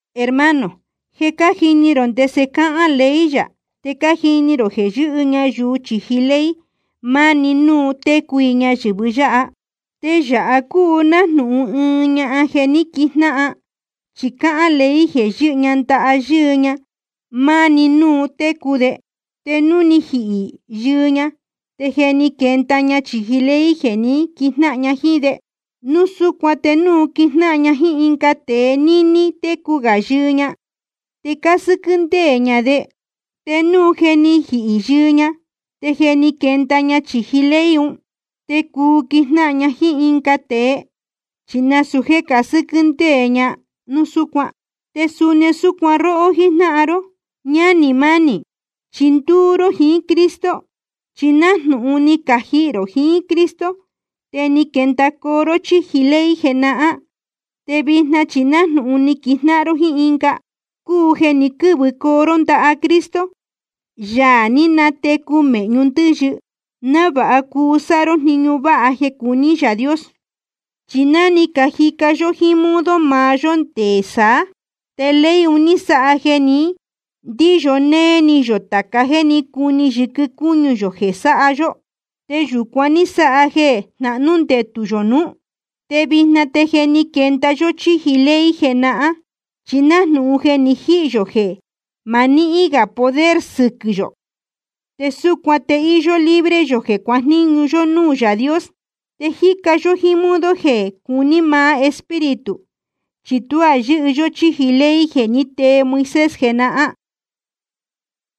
Hermano, je cájini rō ndese cáhán ley yā, te cájini rō jeē yɨ́hɨ ñayuu chīji ley maá‑ni núu técu i ñayɨ̄vɨ yáha. Te yāha cúu nájnūhun ɨɨn ñahan jeē ní quijnáhan, chi cáhán ley jeē yɨ́hɨ ña ndaha yɨɨ ña maá‑ni núu técu de. Te núu ni jihī yɨɨ ña, te je ni quenda ña chīji ley jeē ní quijnáhan ña jíín de. Núu súcuan te núu quijnáhan ña jíín ɨnga tēe níní técu gā yɨɨ ña, te cásɨ́quɨ́ ndéē ña de. Te núu je ni jihī yɨɨ ña, te je ni quenda ña chīji ley un. Te cuu quijnáhan ña jíín ɨnga tēe, chi nasūu jéē casɨ́quɨ́ ndéē ña núu súcuan. Te suni súcuan róhó jíjnáhan ró, ñánī mánī, chi ndúú ró jiín Cristo. Chi nájnūhun ni cajihī rō jiín Cristo, te ni quendacoo ró chíji ley jenahán. Te vijna chi nájnūhun ni quijnáhan ró jíín ɨnga, cúu jeē ní quɨ̄vɨcoo ró ndaha Cristo, Yaā ni natecu mēhñu ndɨ́yɨ, návāha cuu sáha ró jniñu váha jeē cuní Yaā Dios. Chi ná ni cajica yó jíín modo maá yó nde saá, te ley un ní sáha jeē ní ndīyo néé ni yō tāca jéē cuní yɨquɨ cúñu yō jeē sáha yó. Te yūcuan ní sáha jeē jnahnú ndetū yō nuú. Te vijna te je ni quenda yó chíji ley jenahán, chi nájnūhun je ni jihī yō jeē ma nihín gā poder sɨquɨ̄ yō. Te súcuan te íyó libre yō jeē cuajníñu yó núū Yaā Dios. Te jíca yó jíín modo jeé jéē cuní maá Espíritu, chi tuá yɨ́hɨ yó chíji ley jeē ní tee Moisés jenahán.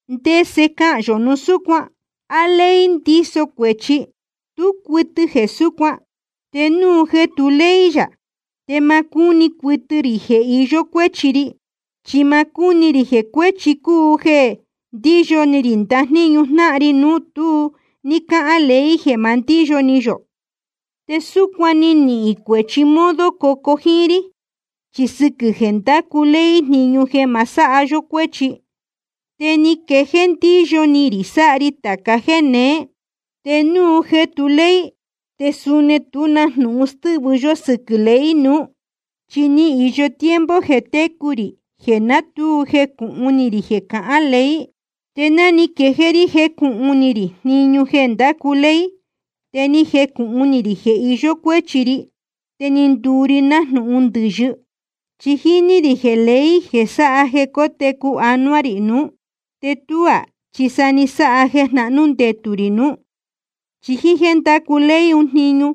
¿Ndese cahān yō núu súcuan? ¿A ley ndíso cuēchi? Tú cuɨtɨ jeē súcuan. Te núu jeē tú ley yā, te ma cúni cuɨtɨ rī jeē iyó cuéchi ri. Chi ma cúni rī jeē cuēchi cúu jeē ndíyo ni rī ndajníñu jnáhan ri núu tu ní cáhán ley jeē ma ndíyo ni yō. Te súcuan ni nihīn cuēchi modo cocuu jíín rí. Chi sɨquɨ̄ jeē ndácu ley jniñu jeē ma sáha yó cuéchi, te ni quejéé ndíyo ni rī sáha ri tāca jéē neé. Te núu jeē tu ley, te suni tú na jnūhun stɨ́vɨ yó sɨquɨ̄ ley nuú. Chi ni īyo tiempo jeē técu rī jeē ná tu jecūhun ni rī jeē cahán ley. Te ná ni quejéé rí jécūhun ni rī jniñu jeē ndácu ley, te ni jecūhun ni rī jeē iyó cuéchi ri, te ni nduu ri nájnūhun ndɨ̄yɨ. Chi ni jini rī jeē ley jeē sáha jeē cótecu anuá rī nuú, te tuú chi sa ni sáha jeē jnahnú ndetū rī nuú. Chi jíín jéē ndácu ley un jniñu,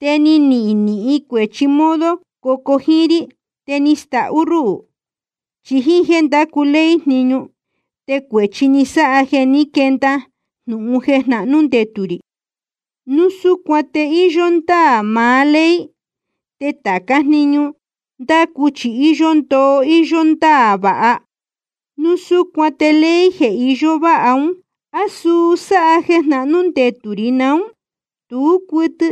te ni nihīn cuēchi modo cocuu jíín rí, te ni stahú ruhū. Chi jíín jéē ndácu ley jniñu, te cuēchi ni sáha jeē ní quenda jnūhun jeē jnahnū ndetū rī. Núu súcuan te íyó ndáā maá ley, te tācá jniñu ndácu chi íyó ndoo íyó ndáā vāha. Núu súcuan te ley jeē iyó váha ún, ¿á suu sáha jeē jnahnú ndetū rī naún? Tú cuɨtɨ.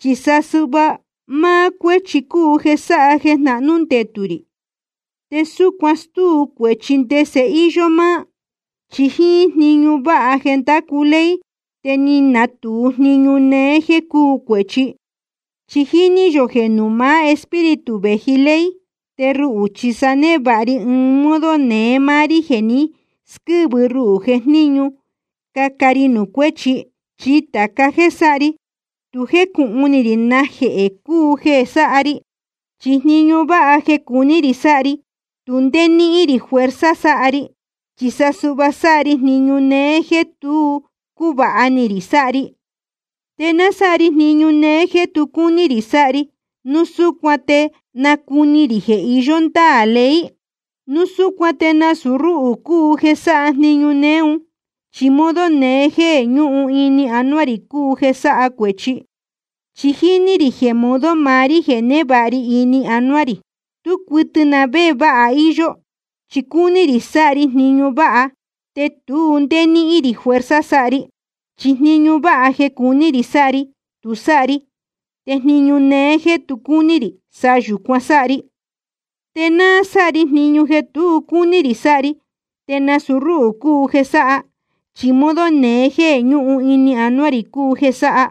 Chi sa suhva máá cuéchi cúu jeē sáha jeē jnahnú ndetū rī, te súcuan stúu cuēchi ndese íyó máá. Chi jíín jniñu váha jeē ndácu ley te ni natūu jniñu néé jéē cúu cuēchi. Chi jíní yō jeē nuū maá Espíritu vēji ley. Te ruhū chi sa névāha ri ɨɨn modo neé máá rí jeē ni squɨ́vɨ ruhū jejníñu cāha rí nuū cuéchi. Chi tāca jéē sáha ri, tu jécūhun ni rī najehē cúu jeē sáha ri. Chi jniñu váha jeē cuní rī sáha ri, tu ndé níhín rī fuerza sáha ri, chi sa suhva sáha ri jniñu néé jéē tu cúvāha ni rī sáha ri. Te náa sáha ri jniñu néé jéē tu cúní rī sáha ri, núu súcuan te nácuni rī jeē iyó ndáā ley. Núu súcuan te nasūu rúhū cúu jeē sáha jniñu néé un, chi modo neé jéē ñúhun ini anuá rī cúu jeē sáha cuēchi. Chi jíní rī jeē modo maá rí jeē névāha ri ini anuá rī, tú cuɨtɨ na vé jeē váha íyó. Chi cúní rī sáha ri jniñu váha, te tu ndé níhín rī fuerza sáha ri. Chi jniñu váha jeē cuní rī sáha ri, tu sáha ri. Te jniñu néé jéē tu cúní rī, sa yūcuan sáha ri. Te náa sáha ri jniñu jeē tu cúní rī sáha ri, te nasūu rúhū cúu jeē sáha, chi modo neé jéē ñúhun ini anuá rī cúu jeē sáha.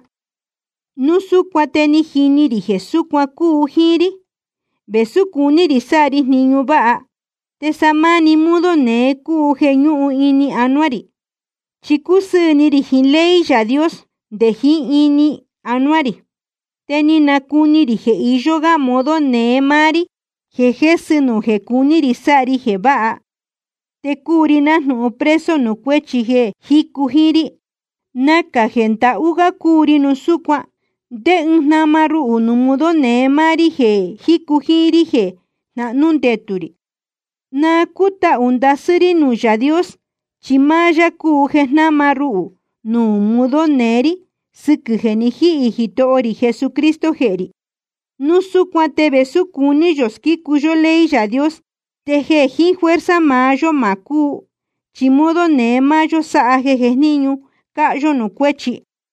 Núu súcuan te ni jini rī jeē súcuan cúu jíín rí: Vēsú cuní rī sáha ri jniñu váha, te sa máni modo neé cúu jeē ñúhun ini anuá rī. Chi cúsɨɨ̄ ni rī jiín ley Yaā Dios nde jiín ini anuá rī. Te ni nacuni rī jeē iyó ɨnga modo neé máá rí jeē jésɨ nuū jeē cuní rī sáha ri jeē váha. Te cúu ri nájnūhun preso nuū cuéchi jeē jícu jíín rí. Nacā jeē ndahú gá cúu ri núu súcuan. ¿Ndé ɨɨn jnama ruhū nuū modo neé máá rí jeē jícu jíín rí jeē jnahnú ndetū rī? Na cútahū ndasɨ́ rí nuū Yaā Dios, chi máá yá cúu jeē jnáma ruhū nuū modo neé rí sɨquɨ̄ jeē ni jíhī Jitoho rī Jesucristo jehē rī. Núu súcuan te vēsú cuní yō squícu yó ley Yaā Dios, te jeē jiín fuerza maá yó ma cúu, chi modo neé máá yó sáha jeē jejníñu cāha yó nuū cuéchi.